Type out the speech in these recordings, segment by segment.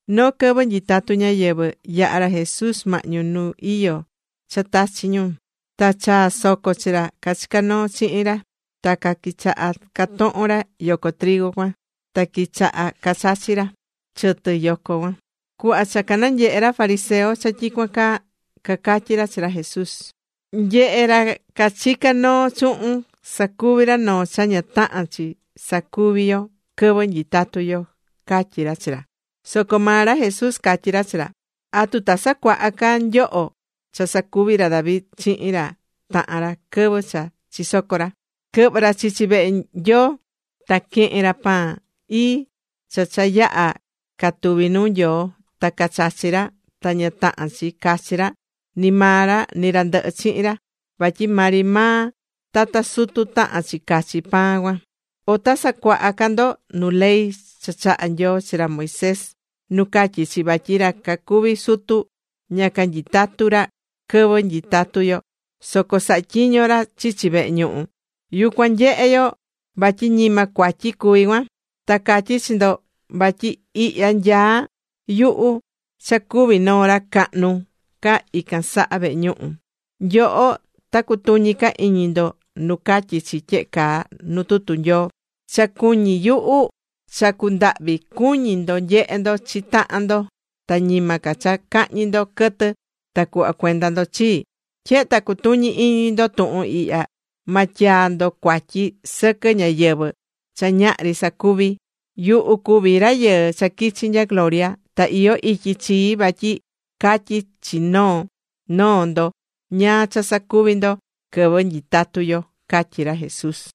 Noo quɨvɨ nyitatú ñáyɨvɨ, yaha̱ ra Jesús mahñu nu iyó cha tachi̱ ñu. Ta chaa̱ soco chi ra cachicá noo chihin ra. Ta quichaha catohon ra yoco cuan ta quichaha cachachi ra chɨtɨ yoco cuan. Cuhva cha cananyehe̱ ra fariseo cha tyicuan caa, cacatyi̱ ra chi ra Jesús: ―Nye̱he, ra cachicá noo chuhun sacuví ra noo cha ña tahán chi sacuví yo quɨvɨ nyitatú yo ―catyí ra chi ra. Soco maa ra Jesús catyí ra chi ra: ―¿Atu ta sacuaha ca nyoho cha sacuvi̱ ra David chihin ra tahan ra quɨvɨ cha chisoco̱ ra? Quɨhvɨ̱ ra chichi vehe Nyoo. Ta quehe̱n ra pan ii cha cha yaha̱ catuvi̱ nuu Nyoo. Ta chachi̱ ra ta ña tahán chi cachi ra, ni maa ra ni ra ndɨhɨ chihin ra, vatyi maa ri maa tata sutu tahán chi cachi pan cuan. ¿O ta sacuaha ca ndo nu ley cha chaha̱ Nyoo chi ra Moisés nu catyí chi vatyi ra cacuví sutu, ña canyitatú ra quɨvɨ nyitatú yo, soco sahá tyiño ra chichi vehe ñuhu? Yucuan nyehé yo vatyi ñima cuatyi cuví cuan. Ta catyí chi ndo, vatyi ihya nyaá yuhu cha cuví noo ra cahnu ca ican saha vehe ñuhu. Nyoho, ta cutuñi ca iñi ndo nu catyí chi tyehe caa nu tuhun Nyoo: “Cha cuñí yuhu, cha cundahvi cuñi ndo nyehe ndo chi tahan ndo, ta ñima ca cha cahñi ndo quɨtɨ ta cuhva cuenda ndo chii.” Tyehe ta cutuñí iñi ndo tuhun ihya, ma tyaa ndo cuatyi sɨquɨ ñáyɨvɨ cha ñahri sacuvi̱. Yuhu cuví Rayɨɨ cha quichi̱ nya gloria. Ta iyó ityi chii vatyi catyi chi noo noo ndo ñáá cha sacuvi ndo quɨvɨ nyitatú yo ―catyí ra Jesús.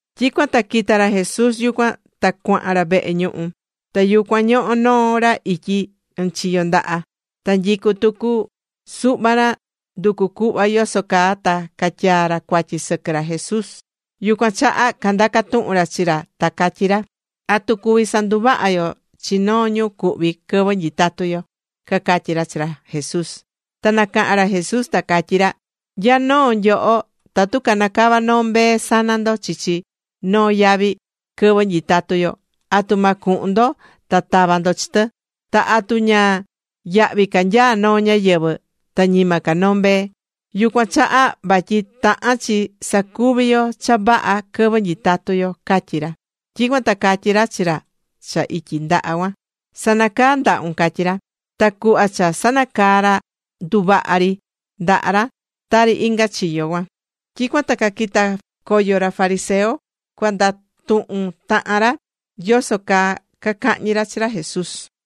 Tyicuan ta quita̱ ra Jesús yucuan, ta cuahan ra vehe ñuhu. Ta yucuan ñohó noo ra ityi ɨnchiyo ndaha. Ta nyicú tucu suhva ra nducu cuhva yoso caa ta catyaa ra cuatyi sɨquɨ ra Jesús. Yucuan chaha candaca̱ tuhun ra chi ra ta catyí ra: ―¿Atu cuví sanduvaha yo chi noo ñu cuhví quɨvɨ nyitatú yo? ―cacatyí ra chi ra Jesús. Ta nacaha̱n ra Jesús ta catyí ra: ―¿Nya noo nyoho, tatu canacava noo mbee sana ndo chichi noo yavi quɨvɨ nyitatu yo, atu ma cuhun ndo ta tava ndo chi tɨ? Ta ¿atu ña yahvi ca nyaá noo ñáyɨvɨ ta ñima ca noo mbee? Yucuan chaha vatyi tahán chi sacuvi yo cha vaha quɨvɨ nyitatú yo ―catyí ra. Tyicuan ta catyí ra chi ra cha ityi ndaha cuan: ―Sa̱nacaa ndahun ―catyí ra. Ta cuhva cha sanacaa̱ ra, nduvaha̱ ri ndaha ra tari inga chiyo cuan. Tyicuan ta caquita̱ coyo ra fariseo cuandatuhun tahan ra yoso caa cacahñi ra chi ra Jesús.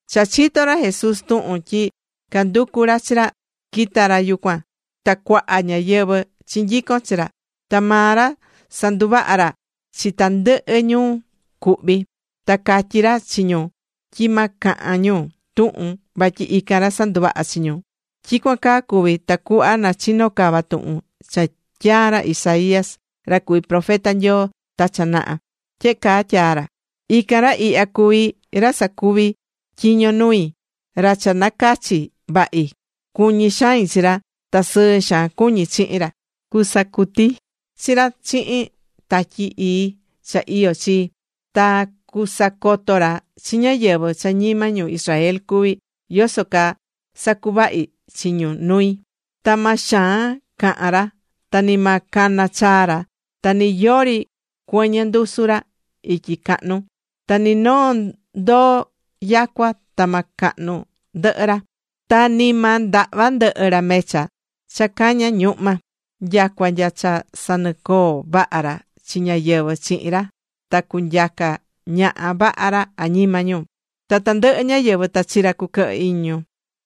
Cha chito̱ ra Jesús tuhun tyi canducú ra chi ra, quita̱ ra yucuan ta cuaha ñáyɨvɨ chinyico̱n chi ra. Ta maa ra sanduvaha̱ ra chi tandɨhɨ ñu cuhví. Ta catyí ra chi ñu tyi ma cahan ñu tuhun vatyi ican ra sanduvaha̱ chi ñu. Tyicuan caa cuvi̱ tacuhva nachino cava tuhun cha tyaa̱ ra Isaías ra cuví profeta Nyoo ta cha naha. Tyehe caa tyaa ra: Ican ra ihya cuví ra sacuvi tyiño nui, ra cha nacachi̱ vahi. Cuñí xain chi ra, ta sɨɨ cuñí chihin ra. Cusacuti chi ra chihin Tatyi Ii cha iyó chii. Ta cusacoto ra chi ñáyɨvɨ cha ñima ñu Israel cuví yoso caa sacuvahi chi ñu nui. Ta ma xaan cahan ra ta ni ma cana chaa ra, ta ni yori cuɨñɨ ndusu ra ityi cahnu. Ta ni noo ndoo yacua, ta ma cahnu ndɨhɨ ra. Ta ni ma ndahva ndɨhɨ ra mecha cha caña ñuhma. Nyacua nya cha sanicoo vaha ra chi ñáyɨvɨ chihin ra ta cunyaca ñaha vaha ra añima ñu. Ta tandɨhɨ ñáyɨvɨ, ta chi ra cuquɨhɨ iñi ñu.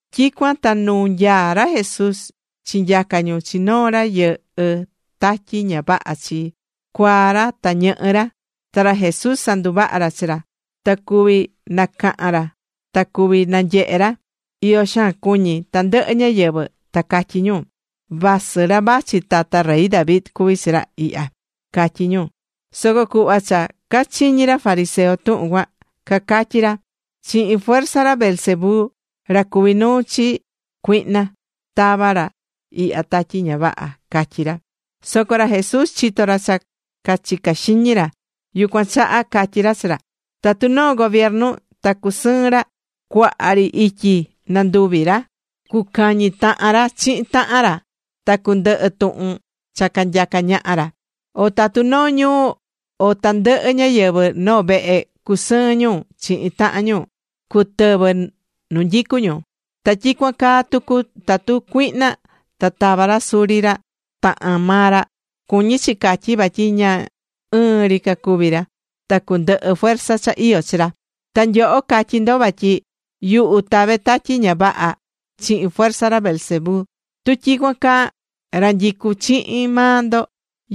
Tyicuan ta nu nyaá ra Jesús chinyaca̱ ñu chi noo ra yɨhɨ́ tatyi ña vaha chi, cuaa ra ta ñɨhɨ ra. Ta ra Jesús sanduvaha̱ ra chi ra. Ta cuvi̱ nacahan ra, ta cuvi̱ nanyehe ra. Iyo xaan cuñí tandɨhɨ ñáyɨvɨ, ta catyí ñu: ―¿Vasɨ ra vachi tata rey David cuví chi ra ihya? ―catyí ñu. Soco cuhva cha cachiñi̱ ra fariseo tuhun cuan, cacatyí ra: ―Chihin fuerza ra Beelzebú, ra cuví nuu chi cuihna, tavá ra ihya tatyi ña vaha ―catyí ra. Soco ra Jesús chitó ra cha cachicá xiñi ra, yucuan chaha catyí ra chi ra: ―Tatu noo gobiernu ta cacusɨɨn ra, cuaha ri ityi nanduvi ra, cucañi tahan ra chihin tahan ra, ta cundɨhɨ tuhun cha canyacá ñaha ra. O tatu noo ñuu o tandɨhɨ ñáyɨvɨ noo vehe cacusɨɨn ñu chihin tahan ñu, cutɨvɨ nu nyicú ñu. Ta tyicuan caa tucu, tatu cuihna ta tava ra suri ra tahan maa ra, cuñí chi catyi vatyi ña ɨɨn ri cacuví ra, ta cundɨhɨ fuerza cha iyó chi ra. Ta nyoho catyí ndo vatyi yuhu tavé tatyi ña vaha chihin fuerza ra Beelzebú. Tu tyicuan caa, ra nyicú chihin maa ndo,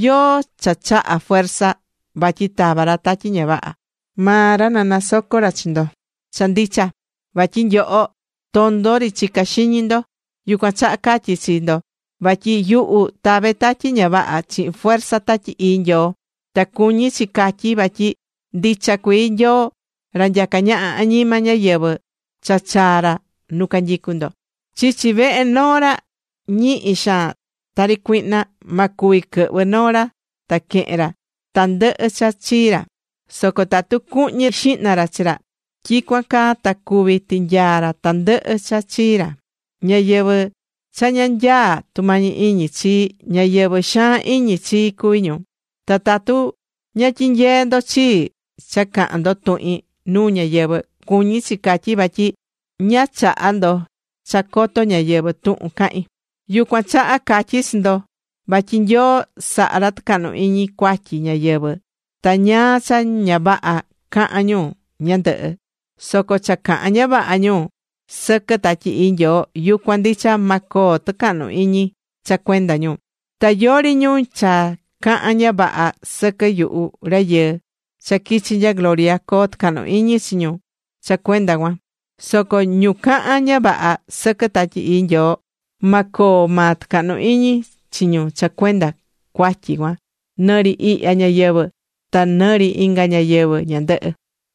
¿yóó cha chaha fuerza vatyi tavá ra tatyi ña vaha? Maa ra na sacoto ra chi ndo cha ndicha, vatyi nyoho tondo ri chicá xiñi ndo. Yucuan chaha catyí chi ndo, vatyi yuhu tave tatyi ña vaha chihin fuerza Tatyi Ii Nyoo. Ta cuñí chi catyi vatyi ndicha cuii Nyoo ra nyacá ñaha añima ñáyɨvɨ cha chaa̱ ra nu canyicú ndo. ’Chichi vehe noo ra ñihi xaan, tari cuihna, ma cuvi quɨhvɨ noo ra ta quehen ra tandɨhɨ cha chii ra, soco tatu cuhñi xihna ra chi ra tyicuan caa ta cuví tinyaa ra tandɨhɨ cha chii ra. ’Ñáyɨvɨ cha ña nyaá tumañi iñi chii, ñáyɨvɨ xaan iñi chii cuví ñu. Ta tatu ña tyinyeé ndo chii cha cahán ndo tuhin nuu ñáyɨvɨ, cuñí chi catyí vatyi ña chahá ndo cha coto ñáyɨvɨ tuhun cahín. ’Yucuan chaha catyí chi ndo vatyi Nyoo sahá ra tɨcahnu iñi cuatyi ñáyɨvɨ, ta ñáá cha ña vaha cahán ñu ñandɨhɨ, soco cha cahan ña vaha ñu sɨquɨ Tatyi Ii Nyoo, yucuan ndicha, ma coo tɨcahnu iñi cha cuenda ñu. Ta yóó ri ñu cha cahán ña vaha sɨquɨ yuhu Rayɨɨ cha quichi̱ nya gloria, coo tɨcahnu iñi chi ñu cha cuenda cuan. Soco ñu cahán ña vaha sɨquɨ Tatyi Ii Nyoo, ma coo maa tɨcahnu iñi chi ñu cha cuenda cuatyi cuan, nɨrɨ ihya ñayɨvɨ̱, ta nɨrɨ inga ñayɨvɨ̱ ñandɨhɨ.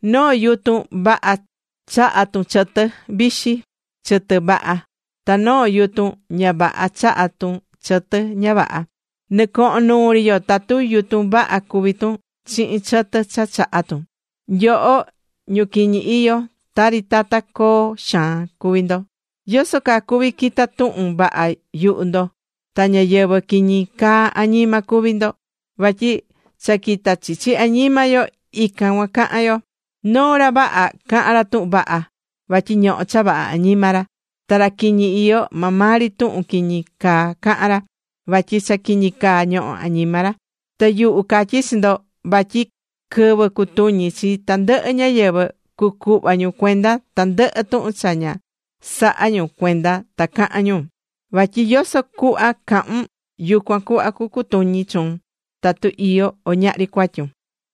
’Noo yutun vaha chahá tun chɨtɨ vixi, chɨtɨ vaha. Ta noo yutun ña vaha chahá tun chɨtɨ ña vaha. Nɨcohón nuu ri yo tatu yutun vaha cuví tun chihin chɨtɨ cha chahá tun. ¡Nyoho, ñu quiñi iyó, tari tata coo xaan cuví ndo! ¿Yoso caa cuví quitá tuhun vaha yuhu ndo, ta ñáyɨvɨ quiñi caa añima cuví ndo? Vatyi cha quitá chichi añima yo ican cuan cahán yo. Noo ra vaha cahán ra tuhun vaha vatyi ñohó cha vaha añima ra. Ta ra quiñi iyó, maa maa ri tuhun quiñi caa cahán ra, vatyi cha quiñi caa ñohó añima ra. Ta yuhu catyí chi ndo vatyi quɨvɨ cutuñi chi tandɨhɨ ñáyɨvɨ, cucuhva ñu cuenda tandɨhɨ tuhun cha ña saha̱ ñu cuenda ta caha̱n ñu. Vatyi yoso cuhva cahún, yucuan cuhva cucutuñi chuun, tatu iyó o ñahri cuatyun.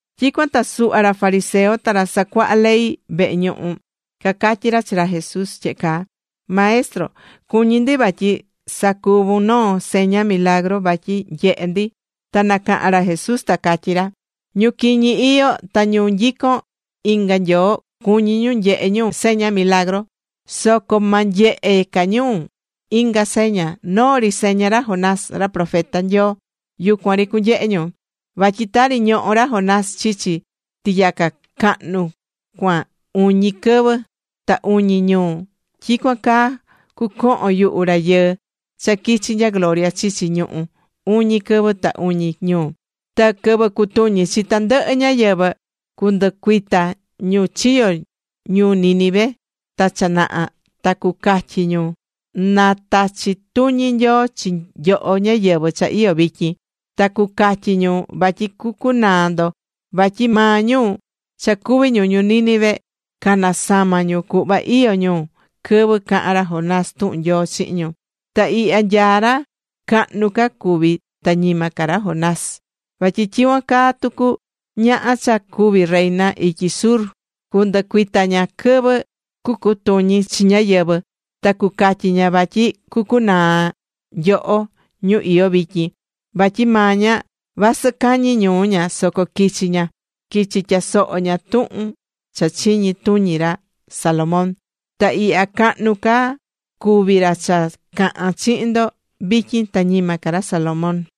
Tyicuan ta suhva ra fariseo ta ra sacuahá ley vehe ñuhu cacatyí ra chi ra Jesús tyehe caa: ―Maestro, cuñí ndi vatyi sacuvun noo seña milagru vatyi nyehe ndi. Ta nacaha̱n ra Jesús ta catyí ra: ―Ñu quiñi iyó ta ñu nyicón inga nyoo cuñí ñu nyehe ñu seña milagru. Soco ma nyehe ca ñu inga seña, noo ri seña ra Jonás ra profeta Nyoo, yucuan ri cunyehe ñu. Vatyi tari ñoho̱ ra Jonás chichi tiyaca cahnu cuan uñi quɨvɨ ta uñi ñuu, tyicuan caa cucohon yuhu Rayɨɨ cha quichi̱ nya gloria chichi ñuhú uñi quɨvɨ ta uñi ñuu. Ta quɨvɨ cucutuñi chi tandɨhɨ ñáyɨvɨ, cundɨcuita ñu chiyo̱ ñuu Ninive ta cha naha ta cucatyi ñu na tachi tuñi Nyoo chi nyoho ñáyɨvɨ cha iyó vityin, ta cucatyi ñu vatyi cucunaa ndo, vatyi maa ñu cha cuví ñu ñuu Nínive, canasama̱ ñu cuhva iyó ñu quɨvɨ caha̱n ra Jonás tuhun Nyoo chihin ñu. Ta ihya nyaá ra cahnu ca cuví ta ñima ca ra Jonás. Vatyi tyicuan caa tucu ñaha cha cuvi̱ reina ityi Sur, cundɨcuita ña quɨvɨ cucutuñi chi ñáyɨvɨ ta cucatyi ña vatyi cucunaa nyoho ñu iyó vityin, vatyi maa ña, vasɨ cañi ñuu ña soco quichi̱ ña, quichi̱ tyasoho ña tuhun cha chiñi tuñi ra Salomón. Ta ihya cahnu ca cuvi ra cha cahán chihin ndo vityin ta ñima ca ra Salomón.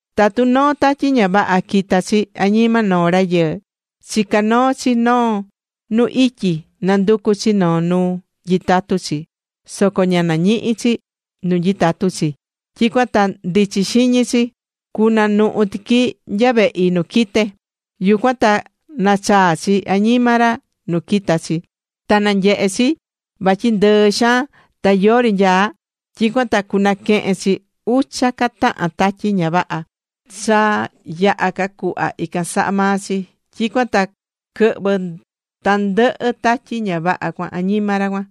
’Tatu noo tatyi ña vaha quita chi añima noo rayɨɨ, chicá noo chi noo nu ityi, nanducú chi noo nu nyitatu chi, soco ña nañihi chi nu nyitatu chi. Tyicuan ta ndichi xiñi chi: “Cunuhu tiqui nya vehi nu quite̱.” Yucuan ta nachaa chi añima ra nu quita̱ chi. Ta nanyehe̱ chi vatyi ndɨɨ xaan, ta yori nyaá. Tyicuan ta cuanaquehen chi ucha ca tahan tatyi ña vaha, cha yaha ca cuhva ican saha maa chi. Tyicuan ta quɨhvɨ tandɨhɨ tatyi ña vaha cuan añima ra cuan.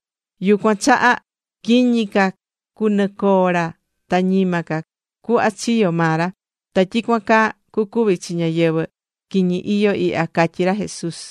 Yucuan chaha, quiñi ca cunɨcoo ra ta ñima ca cuhva chiyo̱ maa ra. Ta tyicuan caa cucuvi chi ñáyɨvɨ quiñi iyó ihya ―catyí ra Jesús.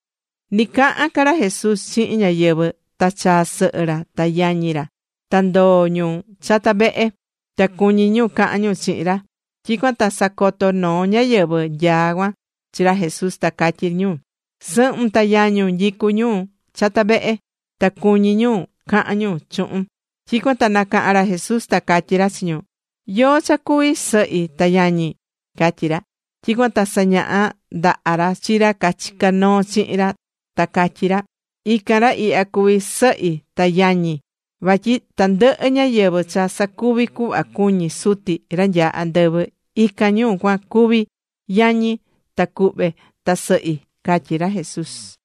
Ni cahán ca ra Jesús chihin ñáyɨvɨ, ta chaa̱ sɨhɨ ra ta yañi ra, ta ndoo̱ ñu chata vehe, ta cuñí ñu cahan ñu chihin ra. Tyicuan ta sacoto̱ noo ñáyɨvɨ nyaá cuan chi ra Jesús, ta catyí ñu: ―Sɨhun ta yañun nyicú ñu chata vehe. Ta cuñí ñu cahan ñu chuhun. Tyicuan ta nacaha̱n ra Jesús ta catyí ra chi ñu: ―¿Yóó cha cuví sɨhi ta yañi? ―catyí ra. Tyicuan ta sañaha̱ ndaha ra chi ra cachicá noo chihin ra, ta catyí ra: ―Ican ra ihya cuví sɨhi ta yañi. Vatyi tandɨhɨ ñáyɨvɨ cha sacuvi cuhva cuñí Suti ra nyaá andɨvɨ, ican ñu cuan cuví yañi, ta cuhve, ta sɨhi ―catyí ra Jesús.